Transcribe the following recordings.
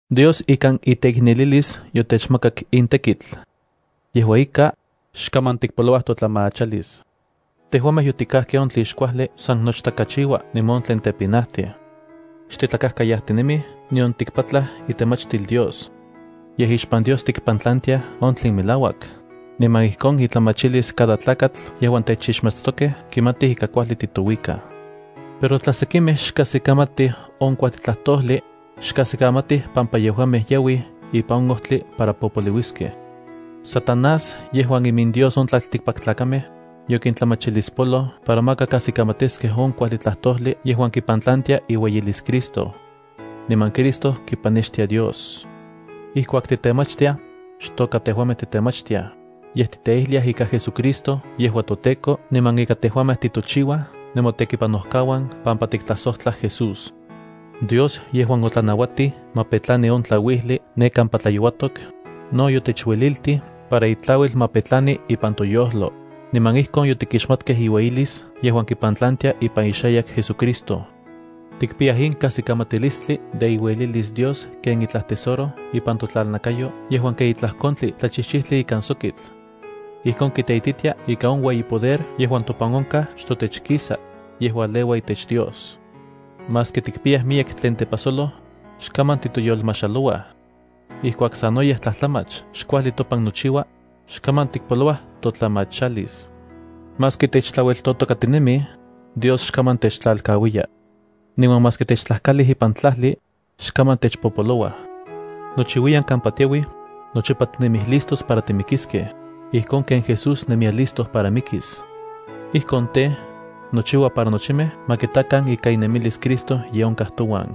Dios ikan iteiknelilis yotechmakak in tekitl. Yejua ika, xkaman tikpolouaj totlamachalis. Tejuamej yotikajkej on tlen xkuajli san nochtakachiua niman on tlen tepinajtij. Xtitlakajkayajtinemij nion tikpatlaj itemachtil Dios. Yej ixpan Dios tikpantlantiaj on tlen melauak, niman ijkon itlamachilis cada tlakatl yejuan techixmatstokej kimatij ika kuajli titouikaj. Pero tla sekimej xkajsikamatij on kuajli tlajtojli, xkajsikamatij pampa yejuamej yauij ipan on ojtli para popoliuiskej. Satanás, yejuan imindios on tlaltikpaktlakamej, yokintlamachilispoloj para maka kajsikamatiskej on kuajli tlajtojli yejuan kipantlantia iueyilis Cristo. Niman Cristo kipanextia Dios. Ijkuak titemachtiaj, xtoka tejuamej titemachtiaj, yej tikteijliaj ika JesuCristo yejua toTEKO niman ika tejuamej titochiua nemotekipanokauan pampa tiktlajsojtlaj Jesús. Dios, yejuan otlanauatij ma petlani on tlauijli ne kampa tlayouatok, no yotechueliltij para itlauil ma petlani ipan toyojlo, niman ijkon yotikixmatkej iueyilis yejuan kipantlantia ipan ixayak JesuCristo. Tikpiyaj in kajsikamatilistli de iuelilis Dios ken itlaj tesoro ipan totlalnakayo yejuan ken itlaj kontli tlachijchijtli ikan sokitl. Ijkon kiteititia ika on ueyi poder yejuan topan onkaj xtotech kisa, yej ualeua itech Dios. Maski tikpiyaj miyek tlen tepajsolo, xkaman titoyolmajxalouaj. Ijkuak sanoyej tlajtlamach xkuajli topan nochiua, xkaman tikpolouaj totlamachalis. Maski techtlaueltotokatinemij, Dios xkaman techtlalkauiya. Niman maski techtlajkalij ipan tlajli, xkaman techpopolouaj. Nochiuiyan kampa tiauij, nochipa tinemij listos para timikiskej, ijkon ken Jesús nemiya listo para mikis. Ijkon tej, nochiua para nochimej ma kitakan ika inemilis Cristo ye onkaj touan.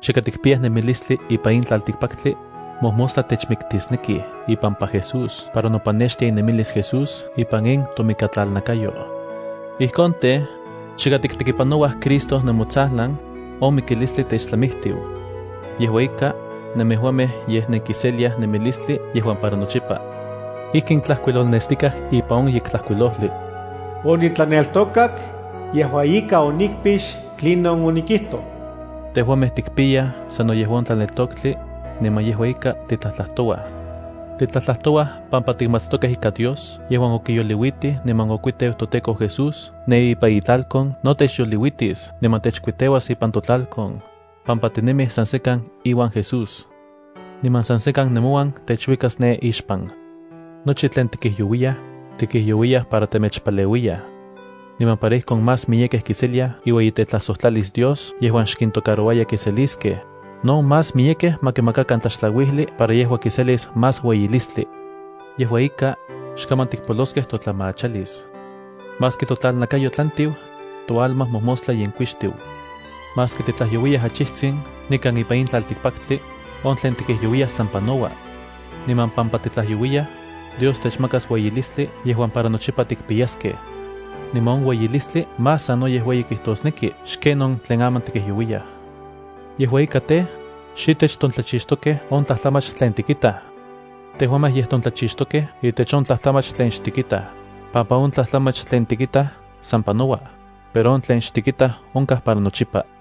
Chika tikpiyaj nemilistli ipan in tlaltikpaktli, mojmostla techmiktisnekij ipampa Jesús para nopanextia inemilis Jesús ipan in tomikatlalnakayo. Ijkon tej, chika tiktekipanouaj Cristo nemotsajlan, on mikilistli techtlamijtiu. Yejua ika, nemejuamej yej nenkiseliaj nemilistli yejuan para nochipa. Ijkin tlajkuilolnestikaj ipan on Yektlajkuilojli: “Onitlaneltokak, yejua ika onikpix tlinon onikijtoj.” Tejuamej tikpiyaj sano yejua on tlaneltoktli, niman yejua ika titlajtlajtouaj. Titlajtlajtouaj pampa tikmatstokej ika Dios yejuan okiyoliuitij niman okuiteu toTEKO Jesús ne ipan itlalkon no techyoliuitis niman techkuiteuas ipan totlalkon, pampa tinemij san sekan iuan Jesús. Niman san sekan nemouan techuikas ne ixpan. Nochi tlen tikijyouiyaj, tikijyouiyaj para temechpaleuiyaj. Niman para ijkon más miyekej kiseliaj iueyitetlajsojtlalis Dios yejuan xkintocarouaya kinseliskej, no más miyekej ma kimakakan tlaxtlauijli para yejua kiselis más ueyilistli. Yejua ika, xkaman tikpoloskej totlamachalis. Maski totlalnakayo tlantiu, toalma mojmostla yenkuixtiu. Maski titlajyouiyaj achijtsin nikan ipan in tlaltikpaktli, on tlen tikijyouiyaj san panoua. Niman pampa titlajyouiyaj, Dios techmakas ueyilistli yejuan para nochipa tikpiyaskej. Niman on ueyilistli más sanoyej ueyi kijtosneki xken on tlen aman tikijyouiyaj. Yejua ika tej, xitech tontlachixtokej on tlajtlamach tlen tikitaj, tejuamej yej tontlachixtokej itech on tlajtlamach tlen xtikitaj, pampa on tlajtlamach tlen tikitaj san panouaj, pero on tlen xtikitaj onkaj para nochipa.